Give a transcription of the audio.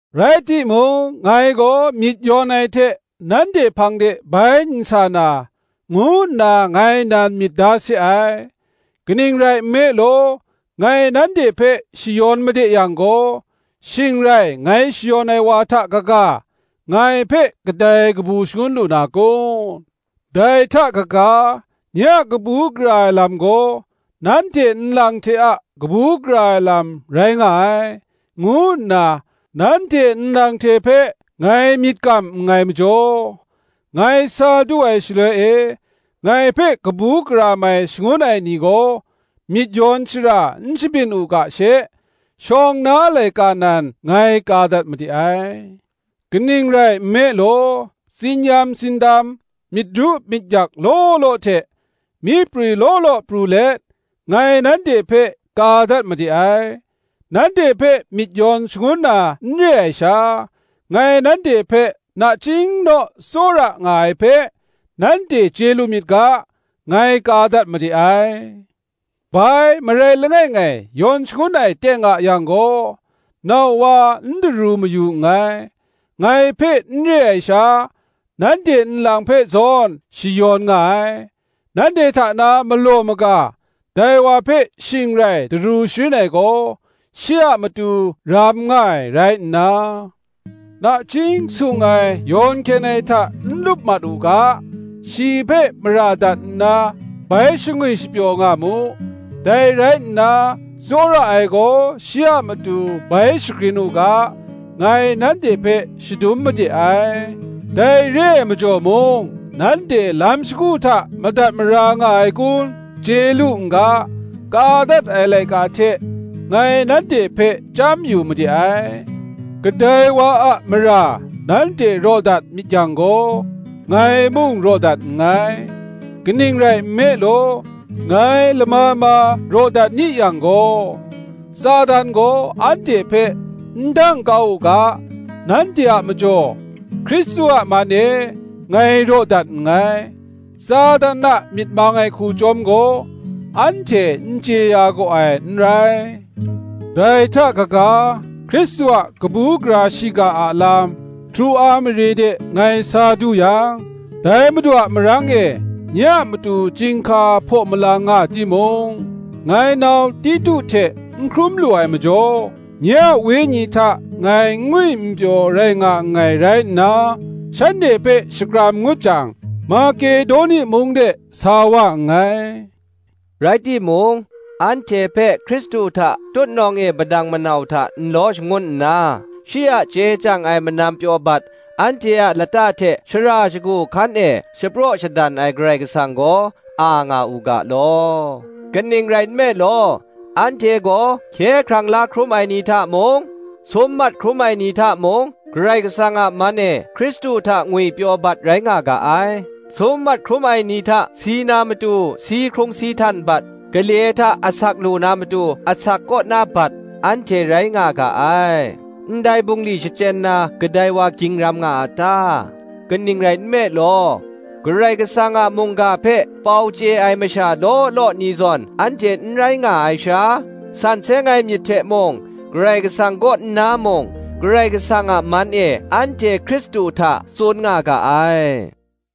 Rai timung, ngai gaw myit yawn ai hte nanhte hpang de bai n sa na, ngu nna ngai nan myit da se ai. Kaning rai nme law, ngai nanhte hpe shayawn made yang gaw, shing rai ngai shayawn ai wa hta kaga, ngai hpe kadai kabu shangun lu na kun? Dai hta kaga, nye a kabu gara ai lam gaw, nanhte nlang hte a kabu gara ai lam rai nga ai, ngu nna nanhte nlang hte hpe ngai myit kam nngai majaw, ngai sa du ai shaloi e ngai hpe kabu gara mai shangun ai ni gaw myit yawn shara n shabyin u ga she, shawng na laika nan ngai ka dat made ai. Kaning rai nme law, tsin-yam tsindam, myit ru myit yak law law hte, myi prwi law law pru let ngai nanhte hpe ka dat made ai; nanhte hpe myit yawn shangun na n re ai sha, ngai nanhte hpe nachying naw tsawra nga ai hpe nanhte chye lu myit ga, ngai ka dat made ai. Bai, marai langai ngai yawn shangun ai teng a yang gaw, (nau wa n daru mayu nngai) ngai hpe n re ai sha, nanhte nlang hpe zawn shayawn nga ai. Nanhte hta na malaw maga dai wa hpe shing rai daru sharin ai gaw, shi a matu ram nga ai rai nna, nachying sung ai yawn hkyen ai hta n lup mat u ga, shi hpe mara dat nna bai shangwi shapyaw nga mu. Dai rai nna tsawra ai gaw shi a matu bai shagrin u ga, ngai nanhte hpe shadum made ai. Dai re ai majaw mung nanhte lam shagu hta madat mara nga ai kun chye lu n ga, ka dat ai laika hte ngai nanhte hpe chyam yu made ai. Kadai wa a mara nanhte raw dat myit yang gaw, ngai mung raw dat nngai: kaning rai nme law, ngai lama ma raw dat ni yang gaw, Satan gaw anhte hpe n dang kau u ga, nanhte a majaw, Hkristu a man e, ngai raw dat nngai; Satan a myit mang ai hku chyawm gaw anhte n chye ya gaw ai n rai. Dai hta kaga, Hkristu a kabu gara shiga a lam, Troa mare de ngai sa du yang, dai Madu a marang e nye a matu chyinghka hpaw malang nga timung, ngai nau Titu hte n hkrum lu ai majaw, nye a Wenyi hta ngai n ngwi n pyaw rai nga nngai rai nna, shanhte hpe shakram ngut jang, Makedoni mung de sa wa nngai. Rai timung, anhte hpe Hkristu hta tutnawng e padang manau hta nlaw shangun nna, shi a chye chyang ai manam pyaw bat anhte a lata hte shara shagu hkan e shapraw shadan ai Karai Kasang gaw, a nga u ga law. Kaning rai nme law, anhte gaw hkye hkrang la hkrum ai ni hta mung, sum mat hkrum ai ni hta mung, Karai Kasang a man e Hkristu hta ngwipyaw bat rai nga ga ai: sum mat hkrum ai ni hta si na matu si hkrung si htan bat, gale hta asak lu na matu asak kaw na bat, anhte rai nga ga ai. Ndai bungli shachyen na kadai wa ging ram nga a ta? Kaning rai nme law, Karai Kasang a mungga hpe pau chye ai masha law law ni zawn anhte n rai nga ai sha, san seng ai myit hte mung, Karai Kasang kaw nna mung, Karai Kasang a man e anhte Hkristu hta tsun nga ga ai.